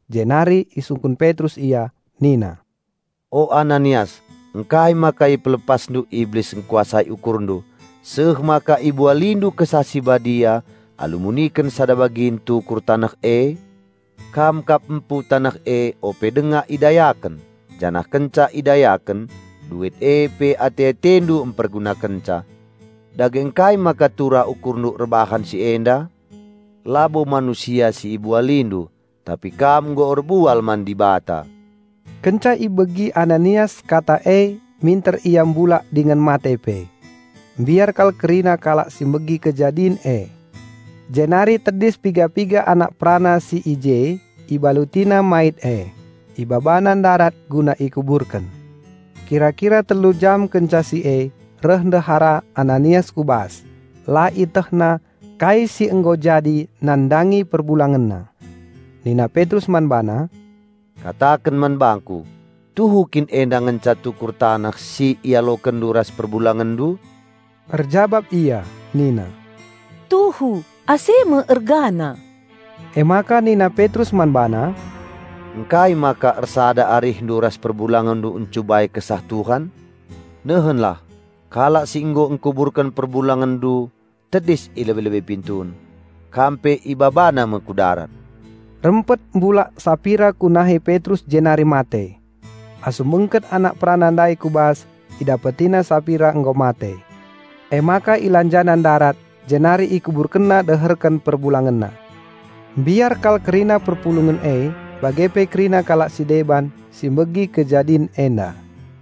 Jenari isungkun Petrus ia nina, "O Ananias ngkai maka ipelepasndu iblis engkuasai ukurndu, seh maka ibualindu Kesah Si Badia alu muniken sada bagin tukur taneh e? Kam kap empu taneh e ope denga idayaken; janah kenca idayaken, duit e pe ate-atendu empergunakenca. Dage ngkai maka turah ukurndu erbahan si enda? Labo manusia si ibualindu, tapi kam nggo erbual man Dibata!" Kenca ibegi Ananias kata e minter ia mbulak dingen mate pe. Mbiar kal kerina kalak si megi kejadin e. Jenari tedis piga-piga anak perana si i je, ibalutina mait e, ibabana ndarat guna ikuburken. Kira-kira telu jam kenca si e, reh ndehara Ananias ku bas, la ietehna kai si nggo jadi nandangi perbulangenna. Nina Petrus man bana, "Kataken man bangku, tuhu kin enda ngenca tukur taneh si ialokenndu ras perbulangenndu?" Erjabap ia nina, "Tuhu, ase me ergana." Emaka nina Petrus man bana, "Ngkai maka ersada arihndu ras perbulangenndu encubai Kesah Tuhan? Nehenlah, kalak si nggo engkuburken perbulangenndu tedis i lebe-lebe pintun. Kam pe ibabana me ku darat." Rempet mbulak Sapira ku nahe Petrus jenari mate. Asum bengket anak perana ndai ku bas idapetina Sapira nggo mate. Emaka ilanjana ndarat jenari ikuburkenna deherken perbulangenna. Mbiar kal kerina perpulungen e, bage pe kerina kalak si deban si megi kejadin enda.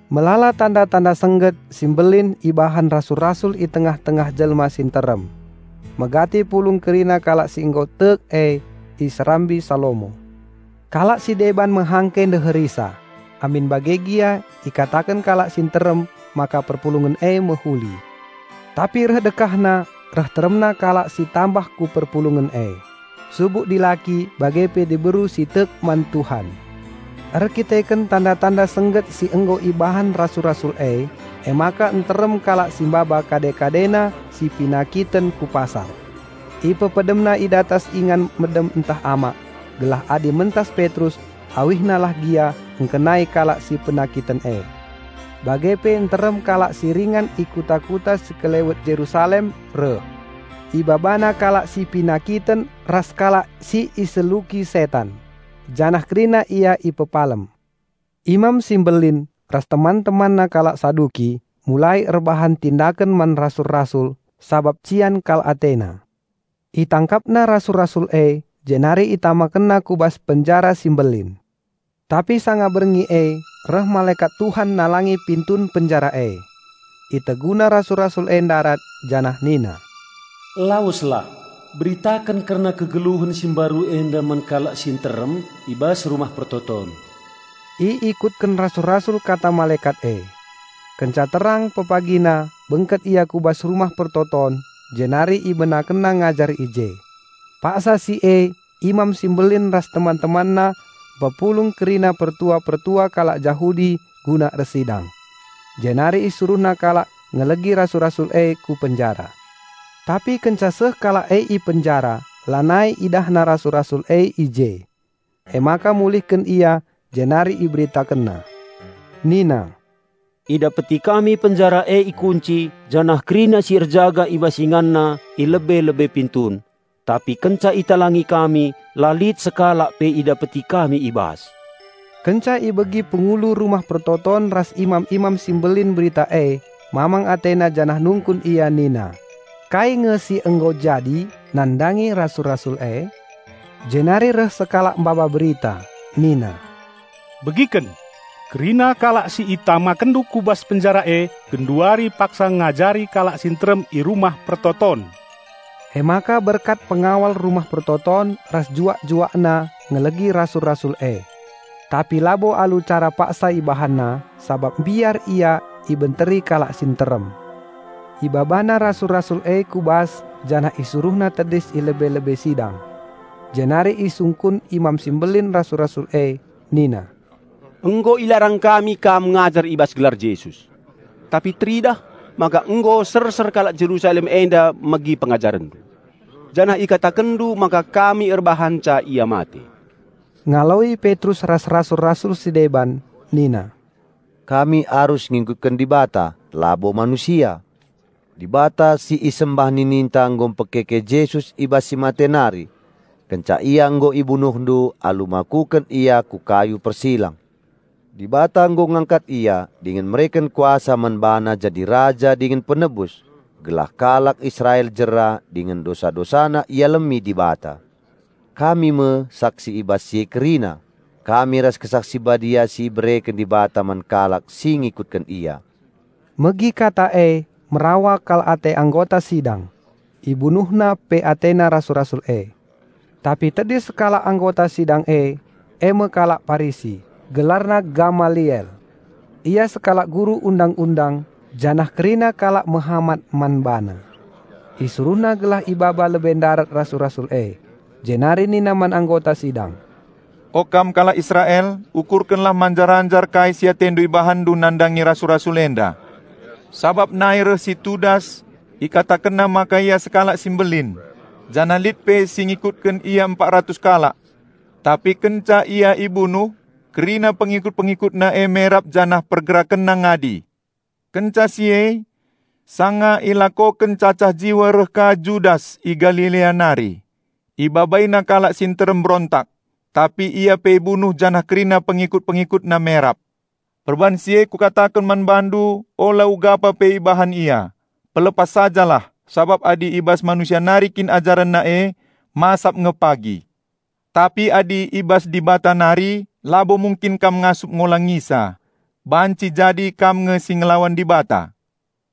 Melala tanda-tanda sengget si mbelin ibahan rasul-rasul i tengah-tengah jelma si nterem. Megati pulung kerina kalak si nggo tek e, i Serambi Salomo. Kalak si deban mehangke ndeherisa, amin bage gia ikataken kalak si nterem maka perpulungen e mehuli. Tapi reh dekahna reh teremna kalak si tambah ku perpulungen e, subuk dilaki bage pe diberu si tek man Tuhan. Erdandanken tanda-tanda sengget si nggo ibahan rasul-rasul e, emaka nterem kalak si maba kade-kadena si penakiten ku pasar. Ipepedemna i datas ingan medem ntah amak, gelah adi mentas Petrus, awihna lah gia engkenai kalak si penakiten e. Bage pe nterem kalak si ringan i kuta-kuta sekelewet Jerusalem reh. Ibabana kalak si penakiten ras kalak si iseluki setan; janah kerina ia ipepalem. Imam si Mbelin ras teman-temanna kalak Saduki, mulai erbahan tindaken man rasul-rasul sabap cian kal atena. Itangkapna rasul-rasul e jenari itamakenna ku bas penjara si mbelin. Tapi sanga berngi e reh malekat Tuhan nalangi pintun penjara e. Iteguna rasul-rasul e ndarat, janah nina, "Laweslah, beritaken kerna kegeluhen si mbaru enda man kalak si nterem i bas Rumah Pertoton." Iikutken rasul-rasul kata malekat e. Kenca terang pepagina bengket ia ku bas Rumah Pertoton, jenari ibenakenna ngajar i je. Paksa si e Imam si Mbelin ras teman-temanna mpepulung kerina pertua-pertua kalak Jahudi guna ersidang. Jenari isuruhna kalak ngelegi rasul-rasul e ku penjara. Tapi kenca seh kalak e i penjara lanai idahna rasul-rasul e i je. Emaka mulihken ia jenari iberitakenna. Nina, "Idapeti kami penjara e ikunci janah kerina si erjaga i bas inganna, i lebe-lebe pintun. Tapi kenca italangi kami, la lit sekalak pe idapeti kami i bas." Kenca ibegi pengulu Rumah Pertoton ras imam-imam si mbelin berita e mamang atena janah nungkun ia nina, Kai nge si nggo jadi nandangi rasul-rasul e? Jenari reh sekalak maba berita nina, "Begiken! Kerina kalak si itamakenndu ku bas penjara e genduari paksa ngajari kalak si nterem i Rumah Pertoton." Emaka berkat pengawal Rumah Pertoton ras juak-juakna ngelegi rasul-rasul e. Tapi labo alu cara paksa ibahanna, sabap mbiar ia ibenteri kalak si nterem. Ibabana rasul-rasul e ku bas janah isuruhna tedis i lebe-lebe sidang. Jenari isungkun Imam si Mbelin rasul-rasul e. Nina, "Nggo ilarang kami kam ngajar i bas gelar Jesus. Tapi teridah, maka nggo serser kalak Jerusalem enda megi pengajarenndu. Janah ikatakenndu maka kami erbahanca Ia mate." Ngaloi Petrus ras rasul-rasul si deban nina, "Kami arus ngikutken Dibata, labo manusia. Dibata si isembah nininta nggo mpekeke Jesus i bas si mate nari, kenca Ia nggo ibunuhndu alu makuken Ia ku kayu persilang. Dibata nggo ngangkat Ia dingen mereken kuasa man BaNa jadi Raja dingen Penebus, gelah kalak Israel jera dingen dosa-dosana ialemi Dibata. Kami me saksi i bas si e kerina, kami ras Kesah Si Badia si ibereken Dibata man kalak si ngikutken Ia." Megi kata e merawa kal ate anggota sidang. Ibunuhna pe atena rasul-rasul e. Tapi tedis sekalak anggota sidang e, eme kalak Parisi, gelarna Gamaliel. Ia sekalak guru Undang-undang janah kerina kalak mehamat man bana. Isuruhna gelah ibaba lebe ndarat rasul-rasul e. Jenari nina man anggota sidang, "O kam kalak Israel, ukurkenlah manjar-anjar kai si atendu ibahanndu nandangi rasul-rasul enda. Sabap nai reh si Tudas, ikatakenna maka ia sekalak si mbelin; janah lit pe si ngikutken ia empat ratus kalak. Tapi kenca ia ibunuh kerina pengikut-pengikutna e merap janah pergerakenna ngadi. Kenca si e, sanga ilakoken cacah jiwa reh ka Judas i Galilea nari. Ibabaina kalak si nterem mbrontak. Tapi ia pe ibunuh janah kerina pengikut-pengikutna merap. Perbahan si e kukataken man bandu, ula ugapa pe ibahan ia. Pelepas sajalah, sabap adi i bas manusia nari kin ajarenna e, masap nge pagi. Tapi adi i bas Dibata nari, labo mungkin kam ngasup ngolangisa. Banci jadi kam nge si ngelawan Dibata."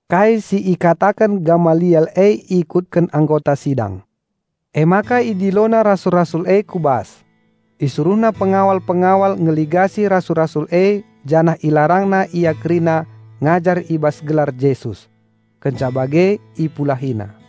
Kai si ikataken Gamaliel e ikutken anggota sidang. Emaka idilona rasul-rasul e ku bas. Isuruhna pengawal-pengawal ngeligasi rasul-rasul e janah ilarangna ia kerina ngajar i bas gelar Jesus. Kenca bage ipulahina.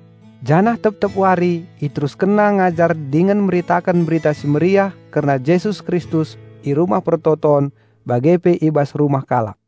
Janah tep-tep wari iteruskenna ngajar dingen meritaken Berita Si Mehuli kerna Jesus Kristus i Rumah Pertoton bage pe i bas rumah kalak.